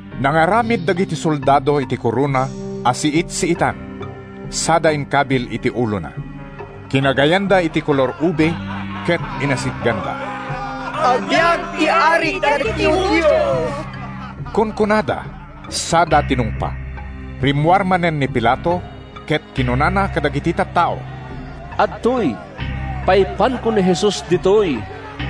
Nangaramid dagiti soldado iti korona a siit-siitan sada inkabil iti ulona. Kinagayanda iti kolor-ube ket inasitganda. “Agbiag ti Ari dagiti Judio!” kunkunada sada tinungpa. Rimmuar manen ni Pilato ket kinunana kadagiti tattao, “Adtoy, paipanko ni Jesus ditoy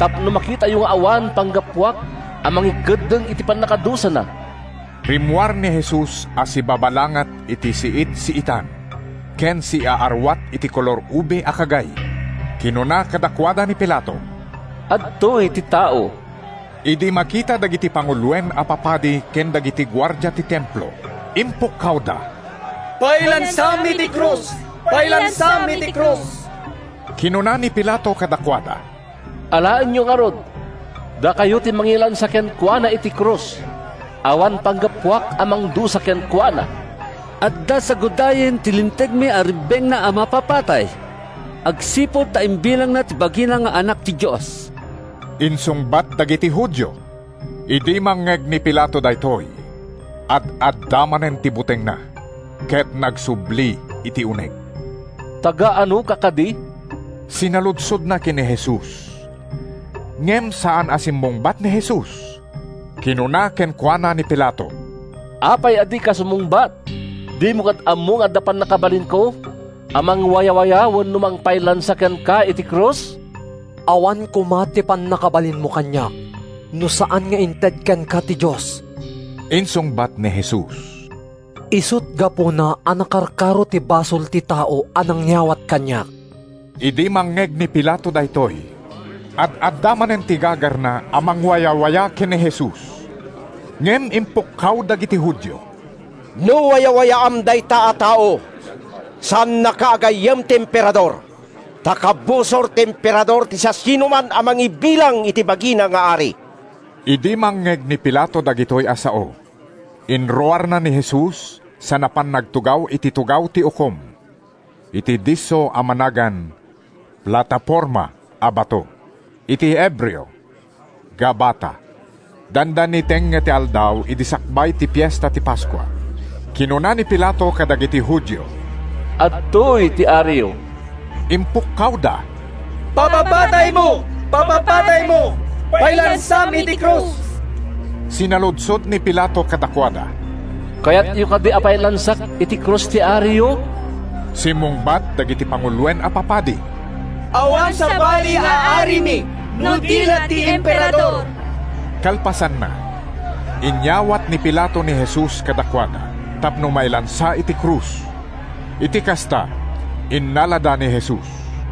tapno makitayo nga awan panggapuak a mangikeddeng iti pannakadusana.” Rimmuar ni Jesus a sibabalangat iti siit-siitan ken siaaruat iti kolor-ube a kagay. Kinuna kadakuada ni Pilato, “Adtoy ti tao!” Idi makita dagiti panguloen a papadi ken dagiti guardia ti Templo, impukkawda, “Pailansam iti krus! Pailansam iti krus!” Kinuna ni Pilato kadakuada, “Alaenyo ngarud. Dakayo ti mangilansa kenkuana iti krus. Awan panggapuak a mangdusa kenkuana.” “Adda sagudayen ti lintegmi a rebbengna a mapapatay agsipud ta imbilangna ti bagina nga Anak ti Dios,” insungbat dagiti Judio. Idi mangngeg ni Pilato daytoy, ad-adda manen ti butengna ket nagsubli iti uneg. “Taga-anoka kadi?” sinaludsodna ken ni Jesus. Ngem saan a simmungbat ni Jesus. Kinuna kenkuana ni Pilato, “Apay a dika sumungbat? Dimo kad ammo nga adda pannakabalinko a mangwayawaya wenno mangpailansa kenka iti krus?” “Awan koma ti pannakabalinmo kaniak no saan nga inted kenka ti Dios,” insungbat ni Jesus. “Isut’ gapuna a nakarkaro ti basol ti tao a nangyawat kaniak.” Idi mangngeg ni Pilato daytoy, ad-adda manen ti gagarna a mangwayawaya ken ni Jesus. Ngem impukkaw dagiti Judio, “No wayawayaam dayta a tao, saannaka a gayyem ti Emperador. Ta kabusor ti Emperador ti siasinoman a mangibilang iti bagina nga ari.” Idi mangngeg ni Pilato dagitoy a sao, inruarna ni Jesus sa napan nagtugaw iti tugaw ti ukom, iti disso a managan “Plataforma a Bato.” (Iti Hebreo: “Gabata.”) Dandani tengnga ti aldaw idi sakbay ti Fiesta ti Paskua. Kinuna ni Pilato kadagiti Judio, “Adtoy ti ariyo!” Impukkawda, “Papapataymo! Papapataymo! Pailansam iti krus!” Sinaludsod ni Pilato kadakuada, “Kayatyo kadi a pailansak iti krus ti ariyo?” Simmungbat dagiti panguloen a papadi, “Awan sabali nga arimi no di la ti Emperador!” Kalpasanna, inyawat ni Pilato ni Jesus kadakuada tapno mailansa iti krus. Iti kasta, innalada ni Jesus.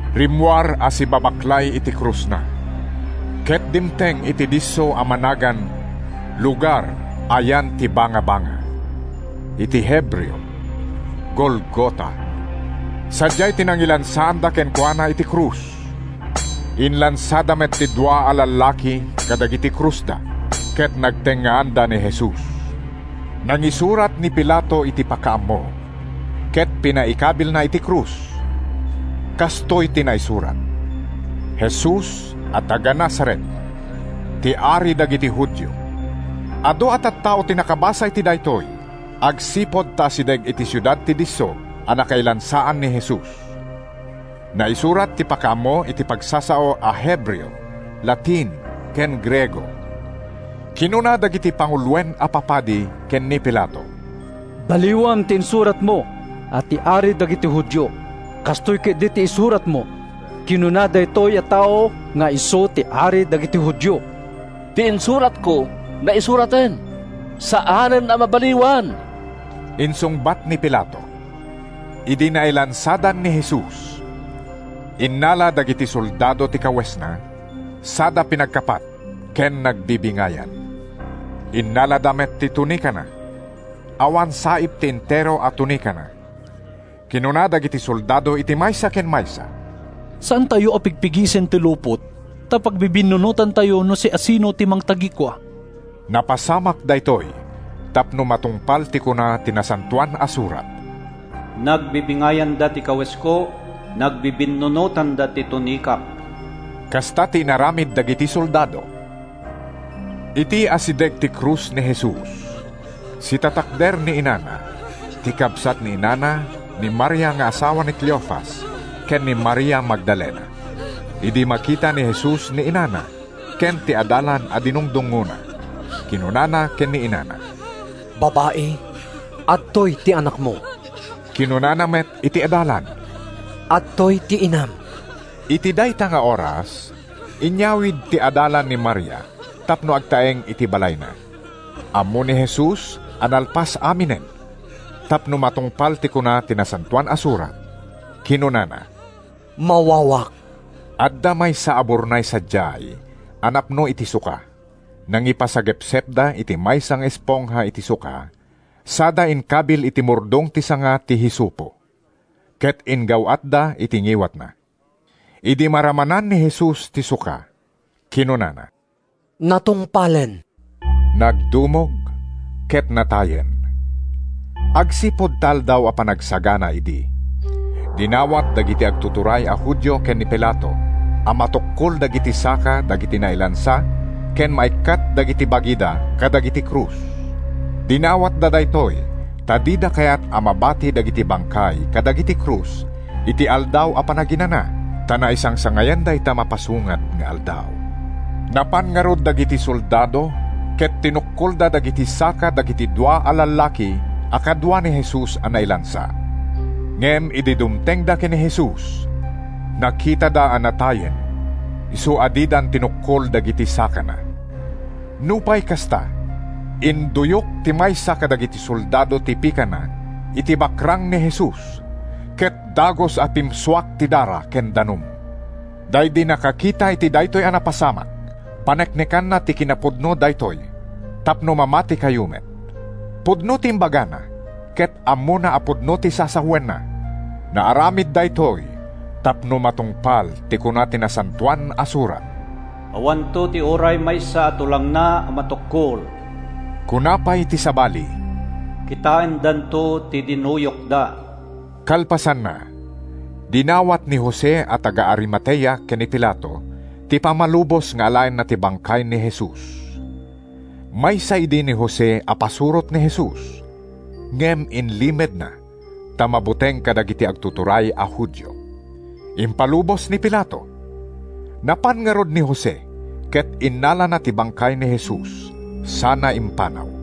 Rimmuar a sibabaklay iti krusna ket dimteng iti disso a managan “Lugar a yan ti Bangabanga.” (Iti Hebreo: “Golgota.”) Sadiay ti nangilansaanda kenkuana iti krus. Inlansada met ti dua a lallaki kadagiti krusda ket nagtengngaanda ni Jesus. Nangisurat ni Pilato iti pakaammo ket pinaikabilna iti krus. Kastoy ti naisurat: “Jesus a taga-Nazaret, ti Ari dagiti Judio.” Adu a tattao ti nakabasa iti daytoy agsipud ta asideg iti siudad ti disso a nakailansaan ni Jesus. Naisurat ti pakaammo iti pagsasao a Hebreo, Latin ken Griego. Kinuna dagiti panguloen a papadi ken ni Pilato, “Baliwam ti insuratmo a ‘Ti Ari dagiti Judio.’ Kastoy ketdi ti isuratmo: ‘Kinuna daytoy a tao nga isu ti Ari dagiti Judio.’” “Ti insuratko, naisuraten. Saanen a mabaliwan,” insungbat ni Pilato. Idi nailansadan ni Jesus, innala dagiti soldado ti kawesna sada pinagkapat ken nagbibingayan. Innalada met ti tunikana. Awan saip ti entero a tunikana. Kinuna dagiti soldado iti maysa ken maysa, “Saantayo a pigpigisen ti lupot, ta pagbibinnunotantayo no siasino ti mangtagikua.” Napasamak daytoy tapno matungpal ti kuna ti Nasantoan a Surat: “Nagbibingayanda ti kawesko, Nagbibinnunotanda ti tunikak.” Kasta ti inaramid dagiti soldado. Iti asideg ti krus ni Jesus, sitatakder ni inana, ti kabsat ni inana, ni Maria nga asawa ni Cleofas ken ni Maria Magdalena. Idi makita ni Jesus ni inana ken ti adalan a dinungdungngona, kinunana ken ni inana, “Babai, adtoy ti anakmo.” Kinunana met iti adalan, “Adtoy ti inam.” Iti dayta nga oras, inyawid ti adalan ni Maria tapno agtaeng iti balayna. Ammo ni Jesus a nalpas aminen. Tapno matungpal ti kuna ti Nasantoan a Surat, kinunana, “Mawawak.” Adda maysa a burnay sadiay a napno iti suka. Nangipasagepsepda iti maysa nga espongha iti suka sada inkabil iti murdong ti sanga ti hisopo, ket inggaw-atda iti ngiwatna. Idi maramanan ni Jesus ti suka, kinunana, “Natungpalen.” Nagdumog ket natayen. Agsipud ta Aldaw a Panagsagana idi, dinawat dagiti agtuturay a Judio ken ni Pilato a matukkol dagiti saka dagiti nailansa ken maikkat dagiti bagida kadagiti krus. Dinawatda daytoy ta dida kayat a mabati dagiti bangkay kadagiti krus iti Aldaw a Panaginana, ta naisangsangayan dayta mapasungad nga aldaw. Napan ngarud dagiti soldado, ket tinukkolda dagiti saka dagiti dua a lallaki a kadua ni Jesus a nailansa. Ngem idi dumtengda ken ni Jesus, nakitada a natayen isu a didan tinukkol dagiti sakana. Nupay kasta, induyok ti maysa kadagiti soldado ti pikana iti bakrang ni Jesus, ket dagus a pimsuak ti dara ken danum. ( Daydi nakakita iti daytoy a napasamak, paneknekanna ti kinapudno daytoy tapno mamatikayo met. Pudno ti imbagana ket ammona a pudno ti sasawenna.) Naaramid daytoy tapno matungpal ti kuna ti Nasantoan a Surat: “Awanto ti uray maysa a tulangna a matukkol.” Kuna pay ti sabali, “Kitaendanto ti dinuyokda.” Kalpasanna, dinawat ni Jose a taga-Arimatea ken ni Pilato ti pammalubos nga alaenna ti bangkay ni Jesus. (Maysa idi ni Jose a pasurot ni Jesus, ngem inlimedna ta mabuteng kadagiti agtuturay a Judio.) Impalubos ni Pilato. Napan ngarud ni Jose ket innalana ti bangkay ni Jesus sana impanaw.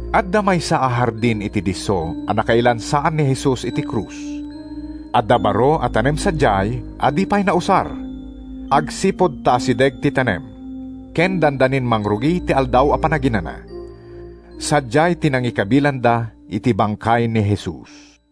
Adda maysa a hardin iti disso a nakailansaan ni Jesus iti krus. Adda baro a tanem sadiay a di pay nausar. Agsipud ta asideg ti tanem ken dandanin mangrugi ti Aldaw a Panaginana, sadiay ti nangikabilanda iti bangkay ni Jesus.